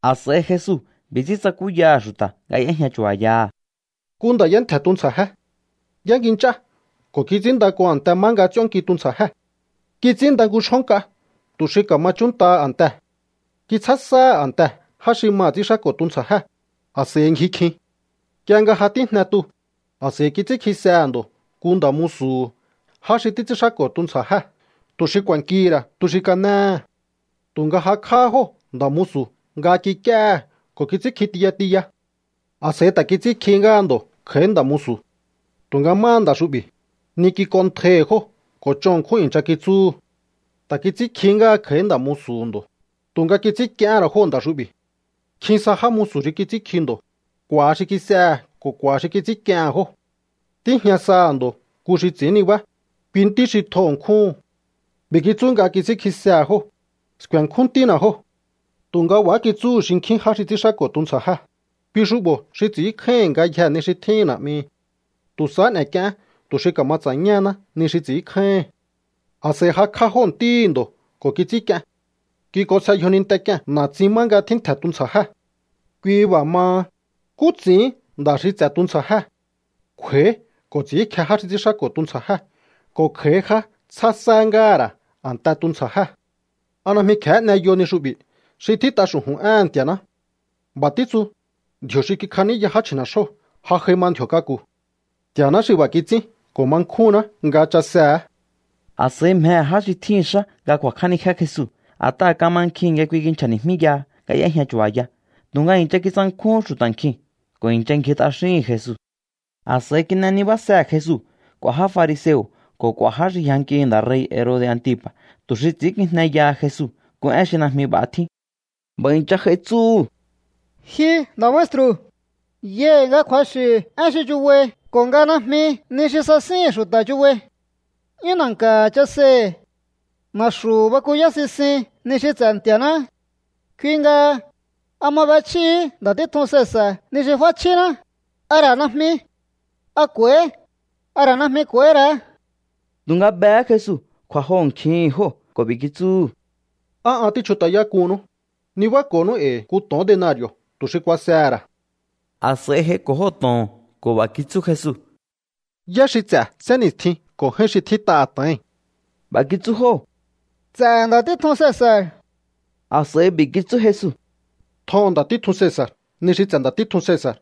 A̱s'a̱i Jesu b'i̱ ts'ín tsakúyaha̱ xu̱ta̱ nga y'éjña chu̱ba̱yaha̱: —Nku nda̱ y'éntje̱ tuntsja̱jé. Y'éngi nch'á ko̱ kits'ínnda nku a̱nte má nga ts'íónnki tuntsja̱jée̱. Kits'ínnda nku xjó nk'a tu̱ xi ka̱ma chúnntaha a̱ntee̱. Kitsjá sáha̱ a̱ntee̱ já xi maha̱ ts'ínxáko̱ tuntsja̱jée̱, a̱s'a̱i ngji kjin. Nk'ie nga ja tíjne tuu̱, a̱s'a̱i kits'ínkjisehe̱ ndo̱ nku nda̱ musu̱hu̱ já xi títs'ínxáko̱ tuntsja̱jée̱ tu̱ xi ku̱a̱nkihi̱ ra̱ tu xi kanéhe̱. Tu̱nga jakj'áhá jóo̱ nda̱ musu̱ nga kik'íéhe̱ ko̱ kits'ínkji tiya tiya. ’A̱s'a̱i ta̱ kits'ínkjihí ngáha ndo̱ kj'a̱í nda̱ musu̱. Tu̱nga máha nda̱ xu'bi̱, ni kik'onntjaihi̱ jóo̱ ko̱ ch'on ṉkjún i̱ncha kitsúhu̱. Ta̱ kits'ínkjihí ngáha kj'a̱í nda̱ musu̱hu̱ ndo̱, tu̱nga kits'ínk'iehén ra̱ jóo̱ nda̱ xu'bi̱. Nkjin sa já musu̱ xi kits'ínkji ndo̱. K'u̱a̱ xi kis'ehe̱ ko̱ k'u̱a̱ xi kits'ínk'iehe̱n jóo̱. ’Tíjña saha̱ ndo̱ nku xi ts'i̱ín nibá, kui ntí xi tjo ṉkjúhu̱n. B'i̱ kitsú nga kits'ínkjisehe̱ jóo̱: “Sku̱e̱nkjún ntína̱ jóo̱.” Tu̱nga b'a̱há kitsúhu̱ xinkjín já xi ts'ínxáko̱ tuntsja̱jée̱: “Kui xu'bo̱ xi ts'i̱ínkjáíhi̱n ngayjee̱ ni xi tjíhi̱n na̱'mihi. Tu̱ sahá n'e̱k'ieén tu̱ xi ka̱ma ts'a̱ñáhaná ni xi ts'i̱ínkjáíhi̱n.” A̱s'a̱i jakj'á jóo̱ ntíhi̱ ndo̱ ko̱ kits'ínk'ien. Kik'onsje yjoninte k'ie̱n na̱tsin má nga tjíntje̱ tuntsja̱jée̱. ’Kui b'a̱ maha, ¿nkú ts'i̱íhin nda̱ xi ts'e̱ tuntsja̱jée̱? Kj'u̱a̱í ko̱ ts'i̱ínkje já xi ts'ínxáko̱ tuntsja̱jée̱ ko̱ kj'a̱í já tsjá sá ngáha̱ ra̱ a̱nte tuntsja̱jée̱. ’¿A najmi kje̱hé n'eyo ni xu'bi̱ xi tjít'a xu̱ju̱n éhe̱n Nti̱a̱ná? B'a̱ títsu: Ndji̱o̱ xi kikjaníya já chji̱ne̱xjóo̱ ja j'ai ma ndji̱o̱ k'aku̱. Nti̱a̱ná xi b'a̱ kits'ín ko̱ ma nkjúnná nga chasehe̱é. A̱s'a̱i mjehe̱ já xi tjíhi̱n xá nga ku̱a̱kj'ánijé Jesu, a̱t'aha̱ kamankjihi̱n nga kui kinchja̱ni̱jmíyaha nga y'éjña chu̱ba̱ya. Tu̱nga i̱ncha kitsankjúhún xu̱ta̱ nkjiu̱n ko̱ i̱ncha ngji t'axíhi̱n Jesu. A̱s'a̱i kin'e nibásehe̱ Jesu k'u̱a̱ já fariseo̱ ko̱ k'u̱a̱ já xi yjankihi̱ nda̱ rei̱ Herode̱ Antipa̱, tu̱ xi ts'i̱ínkijneyaha Jesu nku én xi najmi b'a̱ tjín. B'a̱ i̱ncha j'ai tsúhu̱: —Ji nda̱ maestru̱, yai̱ nga kju̱axi̱ én xi chubai ko̱ nga najmi ni xi sasíhi̱n xu̱ta̱ chubai. 'Yún na̱nka̱ chaseihi̱. Na̱xu̱ bakuyáí sisin ni xi ts'e̱ Nti̱a̱ná. Kui nga, ¿a ma b'echjíhi̱í nda̱ títjun Cesa̱r ni xi f'áchjíná, a ra̱ najmi? ¿A k'u̱a̱íhi̱, a ra̱ najmi k'u̱a̱íhí ra̱á? Tu̱nga behé Jesu kju̱a̱joho̱nkjihi̱n jóo̱ ko̱ b'i̱ kitsúhu̱: —¿Á an tíchjut'ayák'uhunnú? Nibáko̱nú e̱i̱ nku to̱on denari̱o̱ tu̱ xi kuasehe̱ ra̱. A̱s'a̱i j'aiko̱ jóo̱ to̱oo̱n ko̱ b'a̱ kitsú Jesu: —¿Yá xi ts'e̱ sénni̱stjii̱n ko̱ j'áín xi tjít'aha̱ to̱oi̱n? B'a̱ kitsú jóo̱: —Ts'e̱ nda̱ títjun Cesa̱r. A̱s'a̱i b'i̱ kitsú Jesu: —Tjoho̱on nda̱ títjun Cesa̱r ni xi ts'e̱ nda̱ títjun Cesa̱r,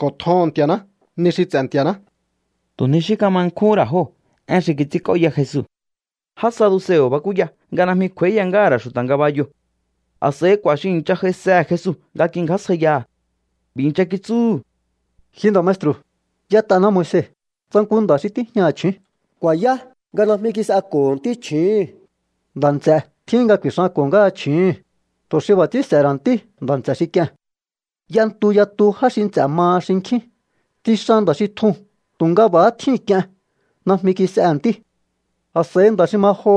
ko̱ tjoho̱on Nti̱a̱ná ni xi ts'e̱ Nti̱a̱ná. Tu̱ ni xí kama nkjúhún ra̱ jóo̱ én xi kits'ínk'óya Jesu. Já saduseo̱ bakúya nga najmi kj'u̱a̱íya ngáha̱ ra̱ xu̱ta̱ ngabayoo̱. A̱s'a̱i k'u̱a̱ xi i̱ncha j'aisehe̱ Jesu nga kingjásjaiyaha̱. B'i̱ i̱ncha kitsúhu̱: —Ji nda̱ maestru̱, y'ét'aná Moise: “Tsa nku nda̱ xi tíjñaha̱ chju̱ún ku̱a̱yá nga najmi kis'eko̱ho̱ ntí chju̱úhu̱n, nda̱ nts'e̱ tjíhin nga ku̱i̱xanko̱ ngáha chju̱úhu̱n, tu̱ xi b'a̱ ts'ín s'e̱he̱ ra̱ ntí nda̱ nts'e̱ xi k'ie̱n.” ’Y'entu yatu já xi nts'e̱ maha xinkjín. Tsixan nda̱ xi tjuu̱n tu̱nga b'a̱há tjíu̱n k'ien. Najmi kis'ehe̱ ntí. A̱s'a̱i nda̱ xi ma joho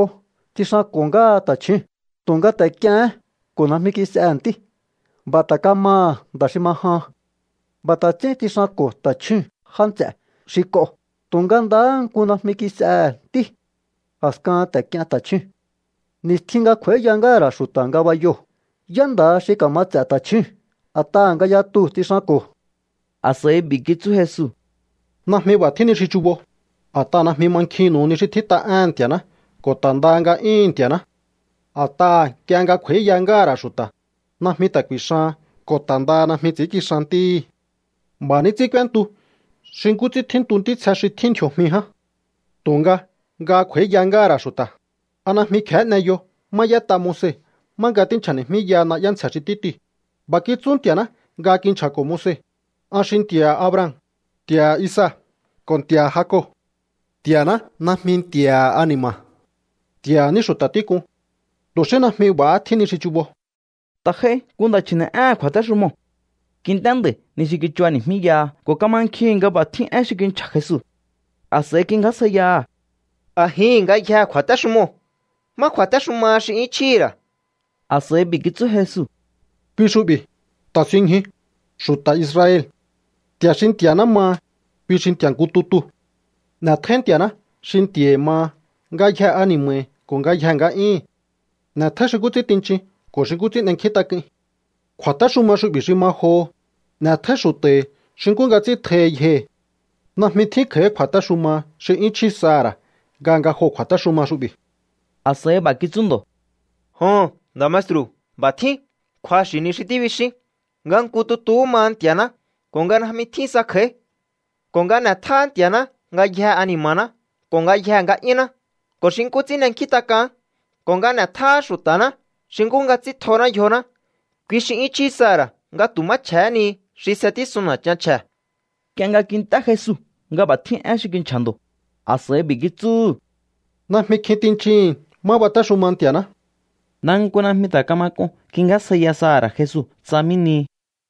tsixanko̱ ngáha ta̱chjúu̱n, tu̱nga ta̱ k'iehén ko̱ najmi kis'ehe̱ ntí. B'a̱ ta̱ kamaha̱ nda̱ xi ma jahan. B'a̱ ta̱ ts'ín tsixanko̱ ta̱chjúu̱n já nts'e̱ xi k'oo̱, tu̱nga ndahá nku najmi kis'ehe̱ ntí. A̱skahan ta̱ k'ien ta̱chjúu̱n. ’Ni̱stjin nga kj'u̱a̱íya ngáha̱ ra̱ xu̱ta̱ ngabayoo̱, ¿yá nda̱ha xi ka̱ma ts'e̱ ta̱chjúu̱n, a̱t'aha̱ nga yatuu̱ tsixanko̱? A̱s'a̱i b'i̱ kitsú Jesu: —Najmi b'a̱ tjín ni xi chubo, a̱t'aha̱ najmi mankjinnu̱u ni xi tjít'a éhe̱n Nti̱a̱ná ko̱ ta̱ ndaha nga'yúhu̱n Nti̱a̱ná. A̱t'aha̱ nk'ie nga kj'u̱a̱íya ngáha̱ ra̱ xu̱ta̱, najmi ta̱ ku̱i̱xahan ko̱ ta̱ ndaha najmi ts'i̱ínkixan ntíhi̱. B'a̱ ní ts'ín k'úéntu xi nkú ts'ín tjíntu ntítsje xi tjín ndji̱o̱jmi ján. ’Tu̱nga nga kj'u̱a̱íya ngáha̱ ra̱ xu̱ta̱, ¿a najmi kje̱hé n'eyo má y'ét'a Moise má nga tínchja̱ni̱jmíyaha na'yá ntsje̱ xi títiu̱? B'a̱ kitsú Nti̱a̱ná nga kinchja̱ko̱ Moise: “An xi Nti̱a̱ha̱ Abraham, Nti̱a̱ha̱ Isaac ko̱ Nti̱a̱ha̱ Jacob.” Nti̱a̱ná najmi Nti̱a̱ha̱ ani̱ma̱. Nti̱a̱ha̱ ní xu̱ta̱ tík'un. Tu̱ xí najmi b'a̱há tjín ni xi chubo. Ta̱ j'ai nku nda̱ chji̱ne̱'éhe̱n kju̱a̱téxumoo̱. Kint'é nda̱i̱ ni xi kichubani̱jmíyaha ko̱ kamankjihi̱n nga b'a̱ tjín én xi kinchja̱ Jesu. A̱s'a̱i kingjásjaiyaha̱: —A̱jihi̱n ngayjee̱ kju̱a̱téxumoo̱, ¿má kju̱a̱téxumaha xi 'yún chjíhi̱ ra̱? A̱s'a̱i b'i̱ kitsú Jesu: —Kui xu'bi̱: “Ta̱sinñju, xu̱ta̱ Israel. Nti̱a̱ xi Nti̱a̱ná maha, kui xi Nti̱a̱ nku tutu. N'e̱tjóí Nti̱a̱ná xi Nti̱a̱hi̱ maha ngayjee̱ ani̱ma̱hi̱ ko̱ ngayjee̱ nga'yíhi̱n. N'e̱tjóí xi nkú ts'ín tinchin ko̱ xi nkú ts'ín n'enkjíntak'uin.” Kju̱a̱téxuma xu'bi̱ xi ma joho: “N'e̱tjóí xu̱ta̱hi̱ xi nkú nga ts'ín tjohi yjohi̱.” Najmi tjín kj'a̱í kju̱a̱téxuma xi 'yún chjí saha̱ ra̱ nga nga joo̱ kju̱a̱téxuma xu'bi̱. A̱s'a̱i b'a̱ kitsú ndo̱: —Joho̱n, nda̱ maestru̱, b'a̱ tjín. Kju̱axi̱ ni xi tíbixín, nga nku tutu maha Nti̱a̱ná ko̱ nga najmi tjín sa kj'a̱í. Ko̱ nga n'e̱tjáá Nti̱a̱ná ngayjee̱ ani̱ma̱ná ko̱ ngayjee̱ nga'yúnná ko̱ xi nkú ts'ín n'enkjín t'ak'aán, ko̱ nga n'e̱tjáá xu̱ta̱ná xi nkú nga ts'ín tjoná yjoná, kui xi 'yún chjí saha̱ ra̱ nga tu̱ má chje̱hé ni xi s'etísun na̱chan chje̱. Nk'ie nga kint'é Jesu nga b'a̱ tjín én xi kinchja̱ ndo̱, a̱s'a̱i b'i̱ kitsúhu̱: —Najmi kjin tinchihi̱n má batéxuma Nti̱a̱ná. Ndaha nku najmi ta̱ kama k'un kingjásjaiya saha̱ ra̱ Jesu tsa mí nihi.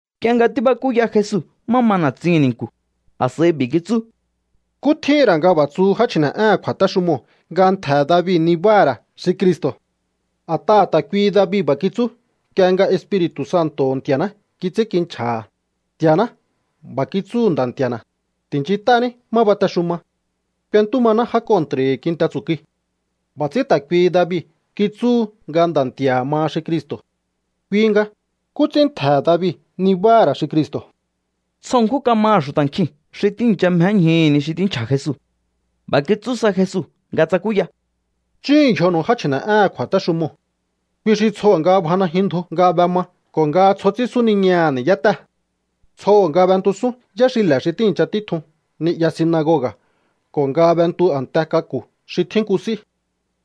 Nk'ie nga tíbakúya Jesu má ma na̱tsihi̱n ni̱nku̱, a̱s'a̱i b'i̱ kitsú: —¿Nkú tjíhi̱n ra̱ nga b'a̱ tsuhu já chji̱ne̱'éhe̱n kju̱a̱téxumoo̱ nga ntje̱he̱ David nibáha̱ ra̱ xi Cristo̱? A̱t'aha̱ ta̱ kuihi David b'a̱ kitsú nk'ie nga Espiri̱tu̱ Santo̱ho̱ Nti̱a̱ná kits'ínkinchja̱ha̱: Nti̱a̱ná b'a̱ kitsúhu̱ Nda̱ Nti̱a̱na̱: “Ti̱nchint'ání má batexuma. K'uentú maná já kontra̱hi̱ kinte tsu̱kui.” B'a̱ ts'ín ta̱ kuihi David kitsúhu nga Nda̱ Nti̱a̱ha̱ maha xi Cristo̱. Kui nga, ¿nkú ts'ín ntje̱he̱ David nibáha̱ ra̱ xi Cristo̱? Tsjo ṉkjún kamaha̱ xu̱ta̱ nkjin xi tíi̱ncha mjéñjuhu̱ ni xi tínchja̱ Jesu. B'a̱ kitsú sa Jesu nga tsakúya: —Chúhu̱un yjonu̱u já chji̱ne̱'éhe̱n kju̱a̱téxumoo̱. Kui xi tsjoho̱ nga bja najyun ndju nga b'ema ko̱ nga tsjo ts'ín súniñaha̱ ni̱yátée̱. Tsjoho̱ nga b'entusún yáxile̱ xi tíi̱ncha títjun ni'ya sinagoga̱ ko̱ nga b'entu a̱nte k'aku̱ xi tjín nku s'í.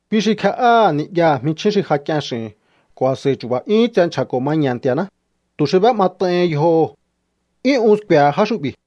Kui xi kje'áha̱ ni'yaha̱ jminchjín xi ja k'ien x'i̱hi̱n ko̱ a̱s'a̱i chu̱ba̱ 'yúhún tse nchja̱ko̱ maña̱ Nti̱a̱ná, tu̱ xi b'é'mat'aihin yjoho̱. 'Yún un sku̱e̱he̱ já xu'bi̱.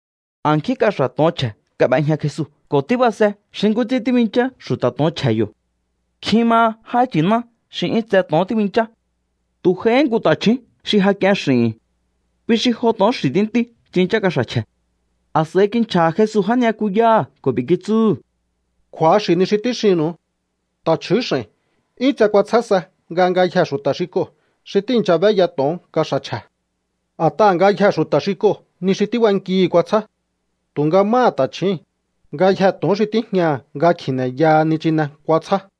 A̱nkjín kaxa̱ to̱on chje̱ kab'ejña Jesu ko̱ tíbase xi nkú ts'ín tíbinchá xu̱ta̱ to̱on chje̱he̱ yo̱. Nkjin maha já nchi̱ná xi 'yún tse to̱on tíbinchá. Tu̱ j'aihí nku ta̱chju̱ún xi ja k'ien x'i̱hi̱n. Kui xi jo to̱on xi̱ tíntí tsinchá kaxa̱ chje̱. A̱s'a̱i kinchja̱ha̱ Jesu já ni'yakuyáha̱ ko̱ b'i̱ kitsúhu̱: —Kju̱axi̱ ni xi tíxinnu̱u. Ta̱chju̱ún x'a̱i̱n 'yún tse kuatsjá sa nga ngayjee̱ xu̱ta̱ xi k'oo̱ xi tíi̱ncha b'éya to̱on kaxa̱ chje̱. A̱t'aha̱ ngayjee̱ xu̱ta̱ xi k'oo̱ ni xi tíb'ankihi̱ kuatsjá. Tu̱nga máha ta̱chjíi̱n, ngayjee̱ to̱on xi tíjñaha̱ nga kji̱ne̱yaha nichine kuatsjá.